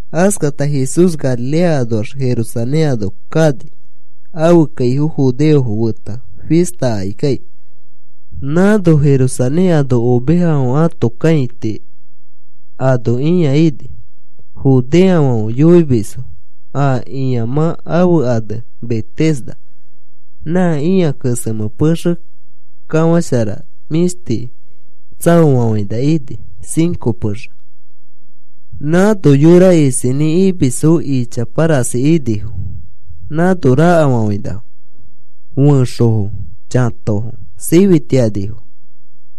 Askata Jesús Galilea anoax Jerusalén ano kani ãfe kaifo judeofo feta fista akikai. Nãno Jerusalén ano ovejafãfe ãto kãiti ano ĩa ini. Judeofãfe yoimisfo a ĩamã ãfe ane Betesda. Nã ĩa kesemẽ pexe kafãshara mĩshti tsaofafãina ini, cinco pexe. Nãno yora isinĩ imisfo ichapa rasi inifo nãno rakafafãinafo. Fẽxofo, chãtofo, sifitianifo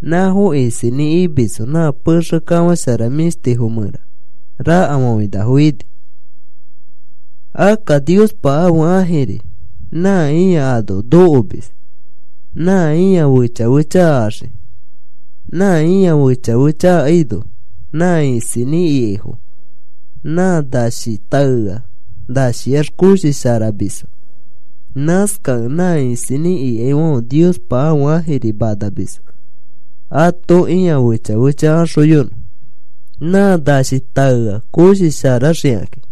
nãfo isinĩ imisfo nã pexe kafãshara mĩshti mẽra rakafafãinafo ini. Akka Niospa ãfe ãjiri nã ĩa ano nokomis nã ĩa fecha fecha axiki. Nã ĩa fecha fecha akaino nã isinĩ ikaifo nã nashi taea nashiax koshi sharamisfo. Nãskakẽ nã isinĩ ikaifãfe Niospa ãfe ãjiri manamisfo ato ĩa fecha fecha axoyonõ nã nashi nã taea koshi sharaxikakĩ.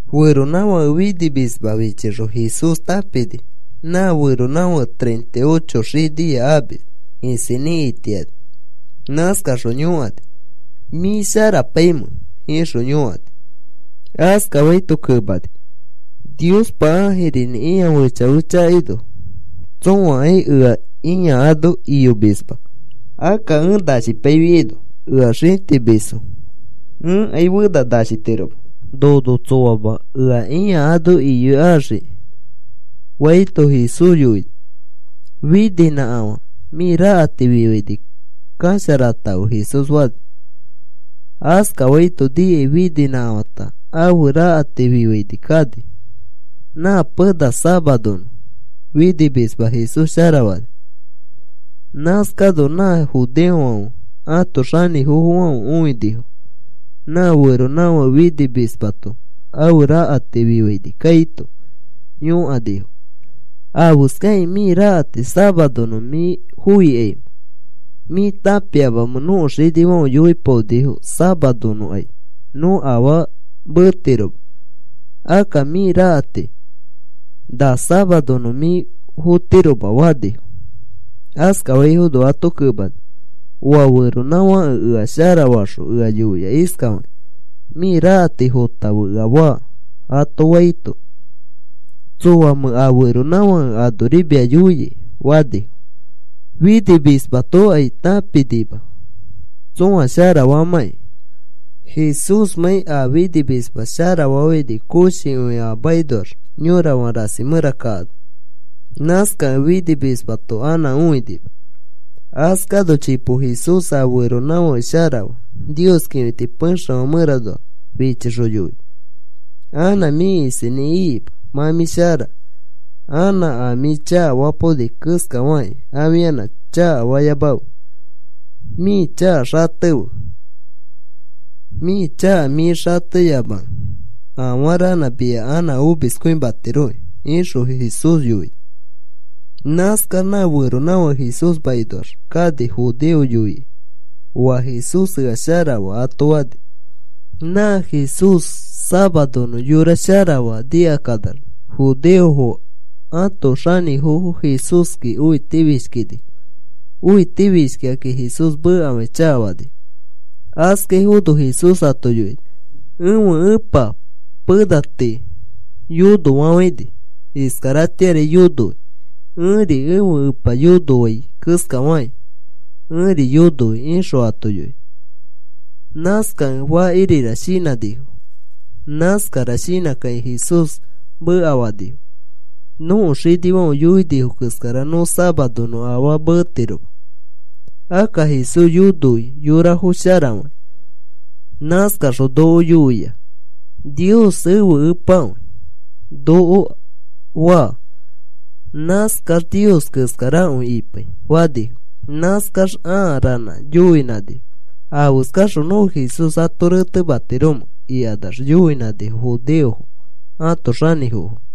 Feronãfake finimisma fichixõ Jesús tãpini nã feronãfake treinta y ocho xiniya amis isinĩ itiani. Nãskaxõ yõkani: “¿Mĩ sharapaimẽ?” ixõ yõkani. Askafaito kemani: “Niospa ãjirinĩ ĩa fecha fecha akaino tsõakai ea ĩa ano iyomisma. Akka ẽ nashipaifiaino ea xĩtimisfo. Ẽkai fena nashitiroma. Nono tsõama ea ĩa ano iyoikaxiki,” faito, Jesús yoini: “Fininãkafã, mĩ rakati fifaini kasharatãfe,” Jesús fani. Askafaito nikai fininãkafãta ãfe rakati fifaini kani. Nã pena safaronõ finimisma Jesús sharafani. Nãskano nã judeofãfe ãto xanĩfofofãfe õinifo nã feronãfake finimismato ãfe rakati fifaini kaito yõkanifo: “¿Afeskakĩ mĩ rakati safaronõ mĩ foikaimẽ? ¿Mĩ tãpiamamẽ nõko xinifãfe yoipaonifo safaroaino nõ afaa metiroma? Akka mĩ rakati na safaronõ mĩ fotiroma,” fanifo. Askafaifono ato kemani: “Oa feronãfãke ea sharafaxõ ea yoia iskafakĩ: ‘Mĩ rakati fotãfe,’ ea faa,” ato faito, “¿Tsõamẽ a feronãfake anori mia yoia?” fanifo. Finimismatokai tãpinima tsõa sharafaamãki Jesúsmãi a finimisma sharafafãini koshikõi a makinoax yorafã rasi mẽra kaano. Nãskakẽ finimismato anã õinima. Askano chipo Jesús a feronãfake sharafaa Nios kĩfiti pexefã mẽranoa fichixõ yoini: “Anã mĩ isinĩ ikima. Mã mĩ shara. Anã a mĩ chakafapaoni keskafakĩ afianã chakafayamafe. Mĩ chaka xatefe. Mĩ chaka mĩ xateyamakẽ afaranã mia anã omiskõimatiroki,” ixõ Jesús yoini. Nãskax nã feronãfake Jesús makinoax kani judeofo yoikai, “Oa Jesús ea sharafaa,” ato fani. Nã Jesús safaronõ yora sharafaa nikakanax judeofo ãto xanĩfofo Jesúski õitifishkinifo. Õitifishkikakĩ Jesús mekafakĩ chakafanifo. Askafaifono Jesús ato yoini: “Ẽfe Epa pena tii yonofafãini. Iskaratĩari yonoi. Ẽri ẽfe Epa yonoai keskafakĩ ẽri yonoi,” ixõ ato yoini. Nãskakẽ fakirira shinãnifo. Nãskara shinãkakĩ Jesús mekafanifo: “Nõko xinifãfe yoini keskara nõ safaronõ afaa metiroma, akka Jesús yonoi yorafo sharafakĩ. Nãskaxõ noko yoia: ‘Nios ẽfe Epakõi,’ noko faa. Nãskax Nios keskarakõi ipai,” fanifo. Nãskax a ranã yoinãnifo: “¿Afeskaxõ nõ Jesús ato retematiromẽ?” ikanax yoinãnifo judeofo ãto xanĩfofo.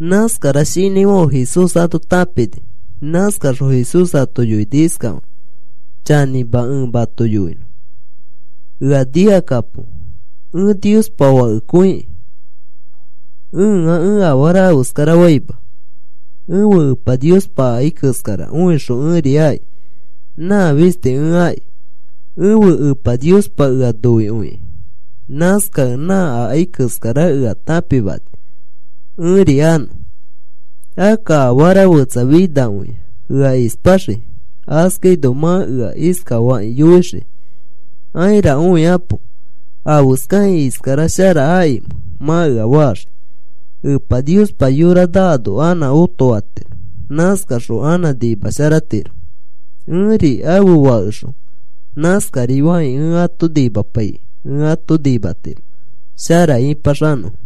Nãskara shinãifãfe Jesús ato tãpini. Nãskaxõ Jesús ato yoini iskafakĩ: “Chanĩma ẽ mato yoinõ. Ea nikakapo. Ẽ Niospa Fakekõikĩ ẽa ẽ afara afeskarafaima. Ẽfe Epa Niospa akai keskara õixõ ẽri aki. Nã fisti ẽ aki. Ẽfe Epa Niospa ea noikõi. Nãskakĩ nã akai keskara ea tãpimani ẽri anõ. Akka afara fetsa finakõia ea ispaxii. Askaino mã ea iskafakĩ yoixii: ‘Aira õikapo. ¿Afeskakĩ iskara shara akimẽ?’ mã ea faxii. Epa Niospa yora naano anã otofatiro. Nãskaxõ anã nimasharatiro. Ẽri ãfe Fakexõ nãskari fakĩ ẽ ato nimapaikĩ ẽ ato nimatiro shara ĩpaxanõfo.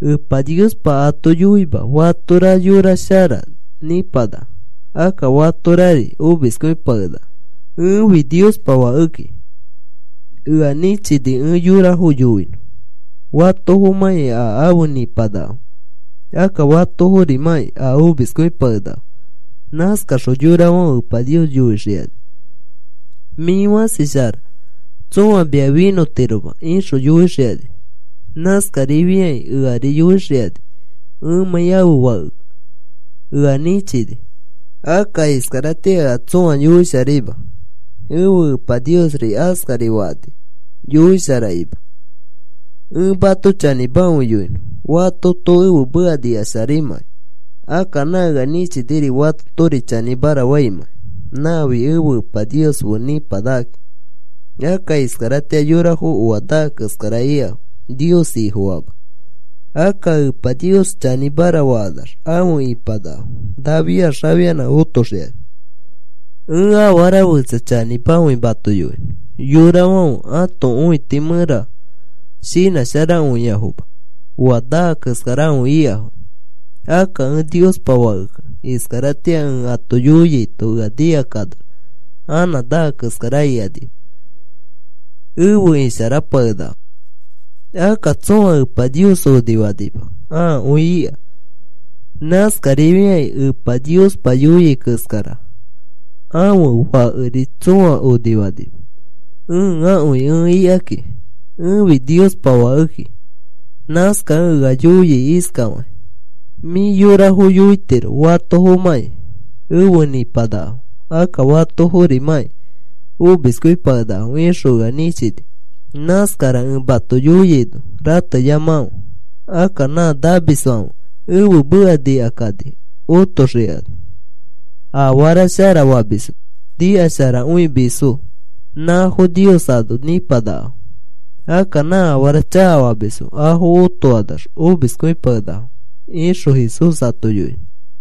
Epa Niospa ato yoima fatora yora shara nĩpanaka, akka fatorari omiskõipakenaka. Ẽfi Niospa Fakeki. Ea nĩchini ẽ yorafo yoinõ fatofomãki a afe nĩpanakafo, akka fatoforimãki a omiskõipakenakafo. Nãskaxõ yorafãfe Epa Nios yoixikani: ‘Mĩ fãsi shara. Tsõa mia finõtiroma,’ ixõ yoixikani. Nãskarifiakĩ eari yoixikani ẽmãi ãfe Fakekẽ. Ea nĩchini. Akka iskaratĩa ea tsõa yoisharaima. Ẽfe Epa Niosri askari fakani yoisharakima. “Ẽ mato chanĩmakõi yoinõ. Fatoto ẽfe meka nikasharaimãkai, akka nã ea nĩchiniri, fatotori chanĩmara faimãkai nãfi ẽfe Epa Nios fe nĩpanakakĩ. Akka iskaratĩa yorafo oa naa keskara ikafo Nios Ifofaamax. Akka Epa Nios chanĩmara fakanax afe ipanakafo. Nafiax afianã otoxikani. “Ẽ afara fetsa chanĩmakõi mato yoinõ. Yorafãfe ãto õiti mẽra shinãsharakõiafoma oa naa keskarakõi ikafo. Akka ẽ Niospa Fakeki. Iskaratĩa ẽ ato yoiaito ea nikakanax anã naa keskara ikanima, efe isharapakenakafo. Akka tsõa Epa Nios onifanima. Akõi ika. Nãskarifiakĩ Epa Niospa yoia keskara ãfe Fakeri tsõa onifanima. Ẽakõi ẽ ikaki. Ẽfi Niospa Fakeki. Nãskakẽ ea yoia iskafakĩ: ‘Mĩ yorafo yoitiro fatofomãki efe nĩpanakafo, akka fatoforimãki omiskõipakenakafo,’ ixõ ea nĩchini. Nãskara ẽ mato yoiaino rateyamakãfe. Akka nã namisfãfe ẽfe meka nikakani otoxikani. Afara shara famisfo nikasharakõimisfo nãfo Nios ano nĩpanakafo. Akka nã afara chakafamisfo afo otokanax omiskõipakenakafo,” ixõ Jesús ato yoini.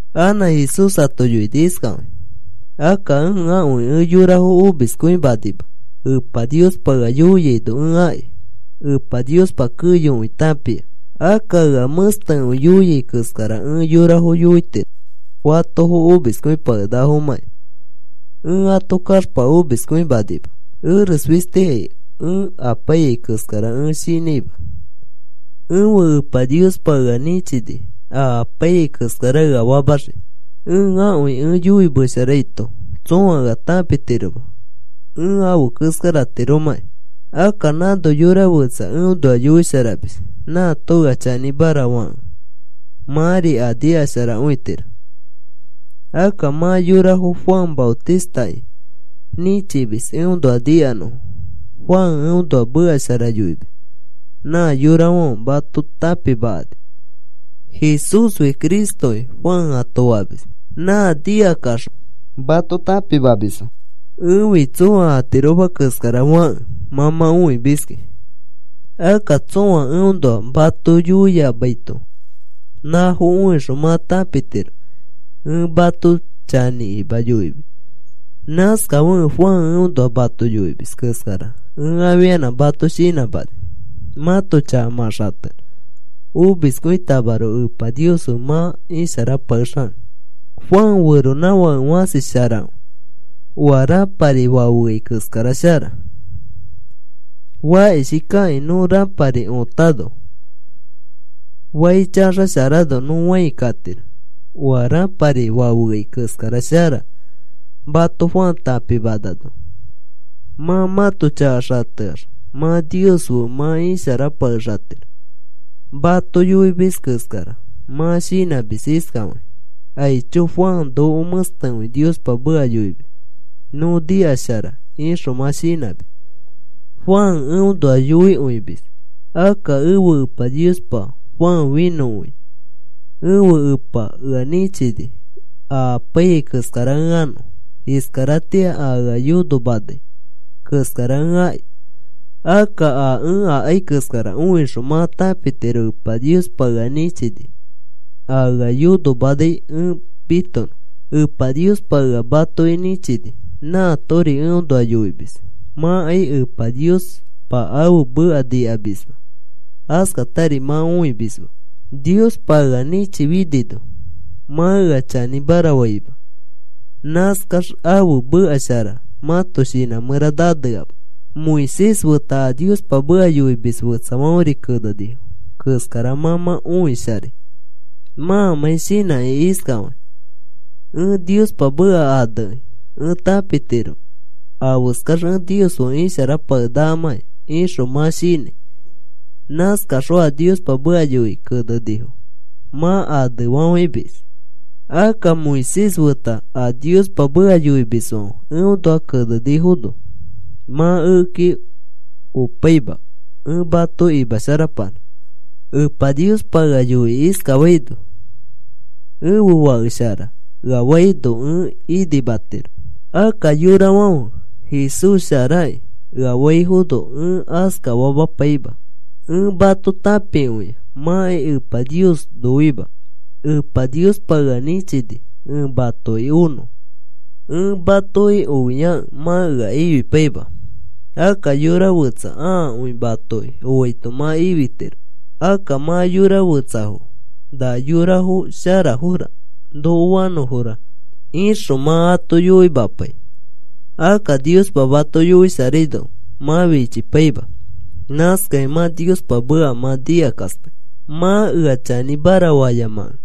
Anã Jesús ato yoini iskafakĩ: “Akka ẽakõi ẽ yorafo omiskõimanima. Epa Niospa ea yoiaino ẽ aki. Epa Niospa keyokõi tãpia. Akka ea mẽstekõi yoia keskara ẽ yorafo yoitiro fatofo omiskõipakenakafomãki. Ẽ ato kaxpa omiskõimanima. Eres fistikai ẽ apaiyai keskara ẽ shinãima. Ẽfe Epa Niospa ea nĩchini a apaiyai keskara ea famaxiki. Ẽakõi ẽ yoimesharaito tsõa ea tãpitiroma ẽ afe keskaratiromakĩ. Akka nãno yora fẽtsa eõnoa yoisharamis. Nãato ea chanĩmara fakẽ mãri a nikasharakõitiro. Akka mã yorafo Juan Maotistaki nĩchimis eõnoa nikanõfo. Juan eõnoa meka shara yoimis nã yorafãfe mato tãpimakani. ‘Jesúsfi Cristoki,’ Juan ato famis. Nã nikakaxõ mato tãpimamisfo. “Ẽfi tsõa atiroma keskara fakẽ mã mã õimiski. Akka tsõa eõnoa mato yoiamaito nãfo õixõ mã tãpitiro ẽ mato chanĩkima yoimis. Nãskafekẽ Juan eõnoa mato yoimis keskara ẽ afianã mato shinãmani mãto chaka mã xatenõ omiskõitamaroko Epa Nios fe mã isharapakexanõ. Juan feronãfake fãsi sharakõi. Oa rãpari fafeai keskara shara. Fakishikakĩ nõ rãpari õtano fai chaxasharano nõ fãi katiro. Oa rãpari fafeai keskara shara mato Juan tãpimanano mã mãto chaka xateax mã Nios fe mã isharapakexatiro. Mato yoimis keskara mã shinãmis iskafakĩ: ‘Aicho, Juan noko mẽstekõi Niospa meka yoimis. Nõ nikashara,’ ixõ mã shinãmis. Juan eõnoa yoikõimis; akka ẽfe Epa Niospa Juan finõkõia. Ẽfe Epa ea nĩchini a apaiyai keskara ẽ anõ. Iskaratĩa a ea yonomanai keskara ẽ aki. Akka a ẽ akai keskara õixõ mã tãpitiro Epa Niospa ea nĩchini a ea yonomanai ẽ mitonõ. Epa Niospa ea matoki nĩchini. Nãatori eõnoa yoimis. Mãkai Epa Niospa ãfe meka nikamisma, askatari mã õimisma. Niospa ea nĩchifinino mã ea chanĩmara faima. Nãskax ãfe meka shara mãto shinã mẽra naneama. “Moisés feta a Niospa meka yoimis fetsafãferi kenenifo keskara mã mã õisharai mãmãi shinãkĩ iskafakĩ: ‘Ẽ Niospa meka anekĩ ẽ tãpitiro afeskax ẽ Nios fe isharapakenakamãki,’ ixõ mã shinãi. Nãskaxõ a Niospa meka yoikĩ kenenifo mã anefafãimis. Akka Moisés feta a Niospa meka yoimisfãfe eõnoa kenefinifono mã ekeki opaima ẽ mato imasharapanã. “Epa Niospa ea yoikĩ iskafaino: ‘Ẽfe fake shara,’ ea faino ẽ inimatiro. Akka yorafãfe, ‘Jesús sharaki,’ ea faifono ẽ askafamapaima. Ẽ mato tãpikõia. Mãkai Epa Nios noima. Epa Niospa ea nĩchini ẽ matoki onõ. Ẽ matoki ofiakẽ mã ea ifipaima. Akka yora fetsa ãakõi matoki oaito mã ifitiro. Akka mã yora fetsafo, ‘Na yorafo sharafora, noko fanõfora,’ ixõ mã ato yoimapai. Akka Niospa mato yoisharaino mã fichipaima. Nãskakĩ mã Niospa meka mã nikakaspai. “Mã ea chanĩmara fayamakẽ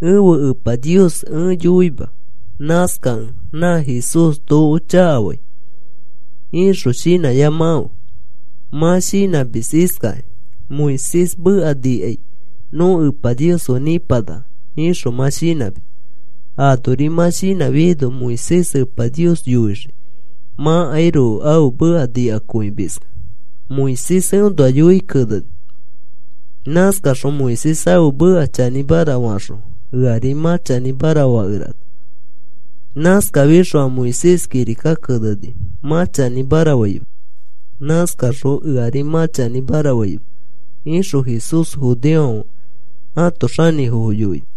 ẽfe Epa Nios ẽ yoima. Nãskakẽ, ‘Nã Jesús noko chakafai,’ ixõ shinãyamakãfe. Mã shinãmis iskakĩ: ‘Moisés meka nikai nõ Epa Nios fe nĩpanaka,’ ixõ mã shinãmis. Anori mã shinãfiaino Moisés Epa Nios yoixii mãkairoko ãfe meka nikakõimiskẽ. Moisés eõnoa yoikĩ keneni. Nãskaxõ Moisés ãfe meka chanĩmara faxõ eari mã chanĩmara fakerana. Nãskafixõ a Moisés kirika keneni mã chanĩmara faima. Nãskaxõ eari mã chanĩmara faima,” ixõ Jesús judeofãfe ãto xanĩfofo yoini.